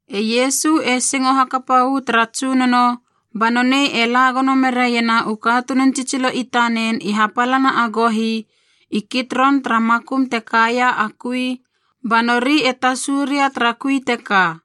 E Iesu e singo hakapa uu tara Tsunono, ba nonei e la gono meraiena u katunun tsitsilo i tanen i hapalana a gohi i Kitron tara makum te kaia a kui, ba nori e tasu ria tara kui teka.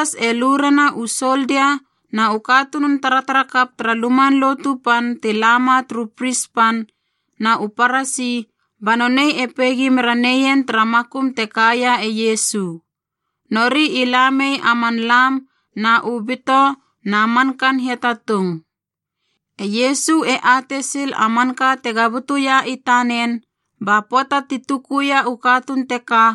Be Judas e lu rena u soldia na u katunun taratarakap tara Luman Lotu Pan ti la ma turu pris pan na u Parasi, ba nonei e peigi mera neien tara makum te kaia e Iesu. Nori i la mei a man lam na u bito na mankaan hiatatung. E Iesu e atei sil a manka tega butuia i tanen. Ba pöata ti tukuia u katuun teka,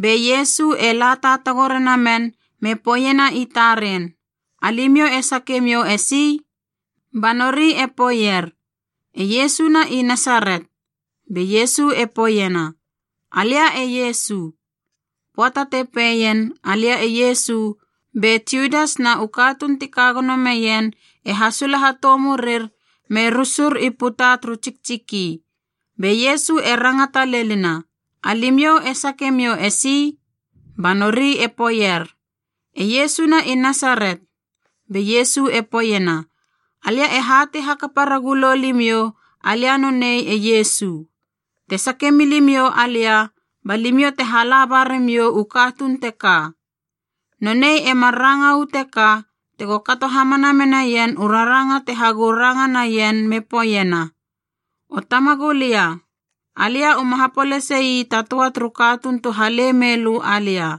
be Iesu e la taatago rena men me poeiena i taren, “Alimiou e sakemiou esi?” Ba nori e poeier, “E Iesu na i Nasaret.” Be Iesu e poeiena, “Alia e Iesu.” Pöata te peien, “Alia e Iesu,” be Judas na u katuun ti ka gono meien e hasula hatou murir me rusur i puta turu tsiktsiki. Be Iesu e rangata lenina, “Alimiou e sakemiou esi?” Ba nori e poeier, “E Iesu na i Nasaret.” Be Iesu e poeiena, “Alia e hatei hakapa ragulou limiou alia nonei e Iesu. Te sake milimiou alia, ba limiou te hala ba ramiou u katuun teka.” Nonei e mar ranga uu teka tego kato hamana menaien u raranga te hagou ranga naien me poeiena, “O Tamagulia, alia uma hapolasei ta töa turu katuun tu hale mei lö alia.”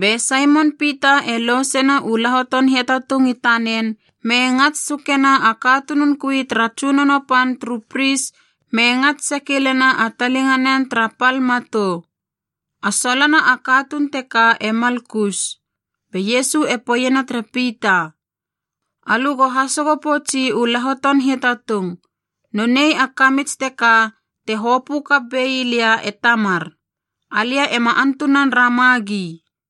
Be Saimon Pita e lousena u lahoton hiatatung i tanen me ngats sukena a katunun kui tara tsunono pan turu pris me ngats sekilena a talinganen tara pal matou. A solona a katuun teka e Malkus. Be Iesu e poeiena tere Pita, “Alö go hasogo poutsi u lahoton hiatatung. Nonei a kamits teka te hopö kap bei lia e Tamar. Alia ema antunan ramagi.”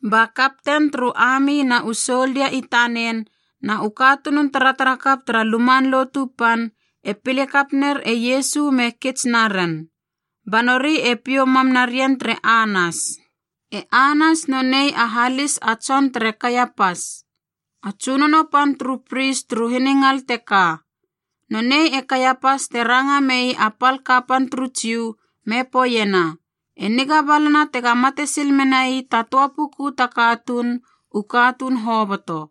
Ba kapten turu ami na u soldia i tanen na u katunun taratarakap tara Luman Lotu Pan e pile kap ner e Iesu me kits naren, ba nori e piou mam narien tere Anas. E Anas nonei a halis a tson tere Kaiapas,a a tsunono pan turu pris turu hiningal teka. Nonei e Kaiapas te ranga mei a pal kapan turu Jiu me poeiena, “E niga balana tega mate sil menai ta töa puku ta katuun, u katuun hoboto.”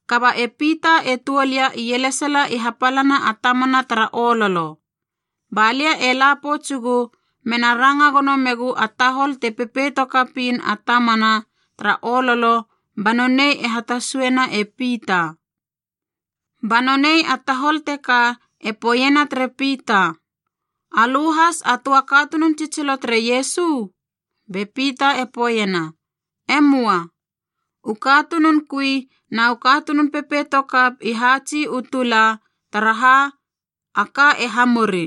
Kaba e Pita e tuol ia ielesala i hapalana a tamana tara ololo. Ba lia e la poutsugu mena ranga gono megu a tahol te pepeito kapiin a tamana tara ololo ba nonei e hatasuena e Pita. Ba nonei a tahol teka e poeiena tere Pita, “Alö has a töa katunun tsitsilo tere Iesu?” Be Pita e poeiena, “E möa.” U katunun kui na u katunun pepeito kap i haatsi u tula, taraha a ka e hamuri.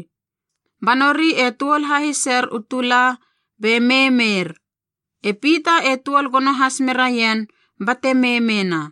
Ba nori e tuol hahiser u tula be meimeir. E Pita e tuol gono has meraien bate meimeina.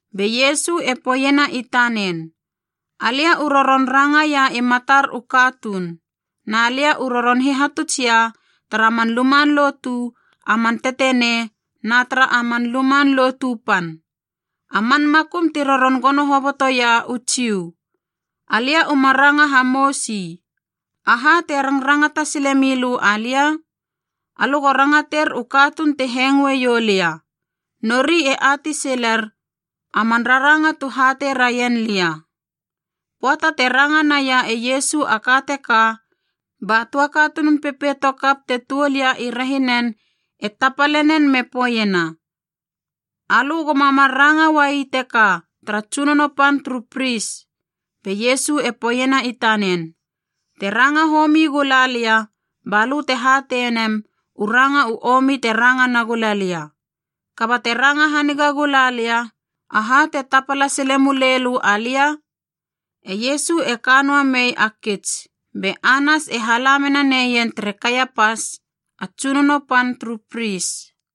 Be Iesu e poeiena i tanen, “Alia u roron rangaia i matar u katuun. Na lia u roron hihatutsia tara man luman lotu a man tetenei na tara a Luman Lotu Pan, a man makum ti roron gono hobotoia u Jiu. Alia uma ranga hamousi. Aha te rangrangata sile milö alia? Alö go rangater u katuun ti hengoe iou lia. Nori e atei siler a man raranga tu hatei raien lia.” Pöata te ranga naia e Iesu a ka teka, ba töa katunun pepeito kap te tuol ia i rehinen e tapale nen me poeiena, “Alö goma mar ranga uai teka tara tsunono pan turu pris!” Be Iesu e poeiena i tanen, “Te ranga homi gula lia, balö te hatei nem u ranga u omi te ranga nagula lia. Kaba te ranga haniga gula lia, aha te tapala sile muleilö alia?” E Iesu e ka noa mei a kits, be Anas e hala mena neien tere Kaiapas, a tsunono pan turu pris.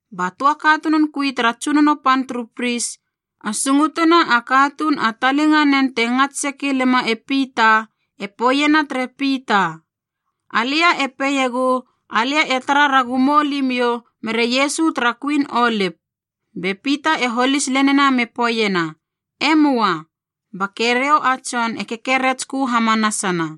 Ba töa katunun kui tara tsunono pan turu pris, a sungutuna a katuun a talinganen te ngats sekilema e Pita, e poeiena tere Pita, “Alia e peiegu alia e tara ragu moulimiou mere Iesu tara kuin olip.” Be Pita e holis lenina me poeiena, “E möa!” Ba keriou a tson e kekeretskö hamanasana.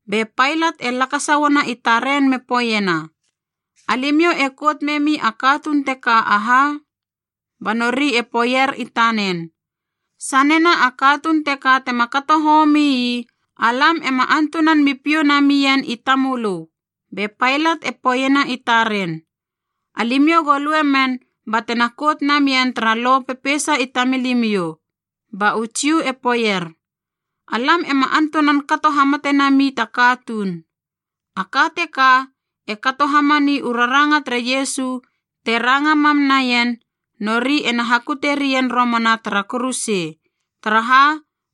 Be Pailat e lakasa uana i taren me poeiena, “Alimiou e kout memi a katuun teka aha?” Ba nori e poeier i tanen, “Sanena a katuun teka tema kato homii, alam ema antunan mi piou nami ien i tamölö.” Be Pailat e poeiena i taren, “Alimiou go lue men batena kout namien tara lo peisa i tamilimiou.” Ba u Jiu e poeier, “Alam ema antunan kato hamate nami ta katuun.” A ka teka e kato hamani u raranga tere Iesu te ranga mam naien nori ena hakutie rien romana tara kuruse, taraha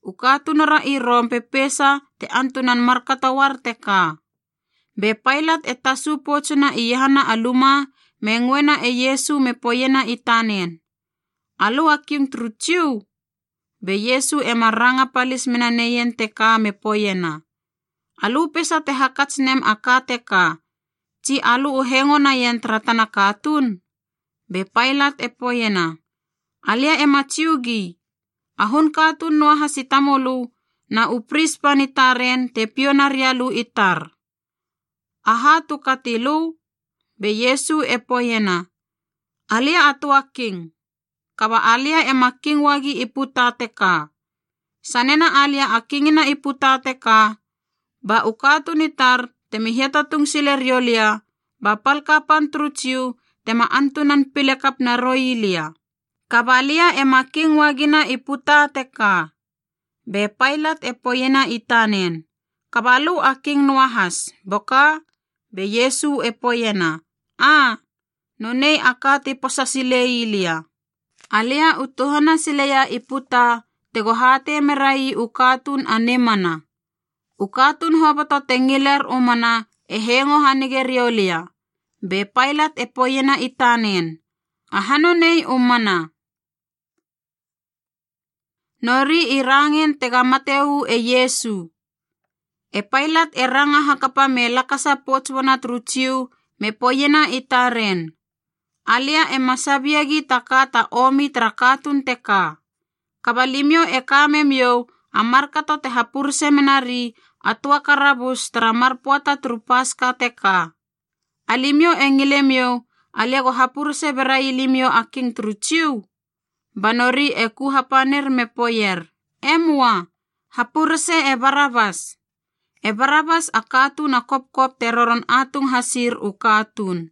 u katunura i Rom pepeisa te antunan markato uar teka. Be Pailat e tasu poutsuna iahana a luma me ngöena e Iesu me poeiena i tanen, “Alö a King turu Jiu?” Be Iesu e mar ranga palis mena neien teka me poeiena, “Alö peisa te hakats nem a ka teka, tsi alö u hengo naien tara tana katuun?” Be Pailat e poeiena, “Alia ema Jiugi! A hun katuun noa has i tamölö na u pris pan i taren te piou naria lö i tar. Aha tu kati lö?” Be Iesu e poeiena, “Alia a töa king, kaba alia ema king uagi i puta teka. Sanena alia a kingina i puta teka, ba u katuun i tar temi hiatatung sile riou lia ba pal kapan turu Jiu tema antunan pile kap naroi lia. Kaba lia ema king uagina i puta teka.” Be Pailat e poeiena i tanen, “Kaba lö a king noahas, boka?” Be Iesu e poeiena, “Aa, nonei a ka ti posa silei lia. Alia u tuhana sileia i puta tego hatei merai u katuun a Nimana. U katuun hoboto te ngiler u Mana e hengo hanige rioulia.” Be Pailat e poeiena i tanen, “Aha nonei, u Mana?” Nori i rangein tega mate uu e Iesu E Pailat e ranga hakapa me lakasa pouts uana turu Jiu me poeiena i taren, “Alia ema sabiegi ta ka ta omi tara katuun teka. Kaba limiou e ka memiou a markato te hapurese menari a töa karabus tara mar pöata turu Paska teka. Alimiou e ngile miou alia go hapurese berai limiou a King turu Jiu?” Ba nori e ku hapanir me poeier, “E möa, hapurese e Barabas!” E Barabas a katuun a kopkop ne roron atung hasir u katuun.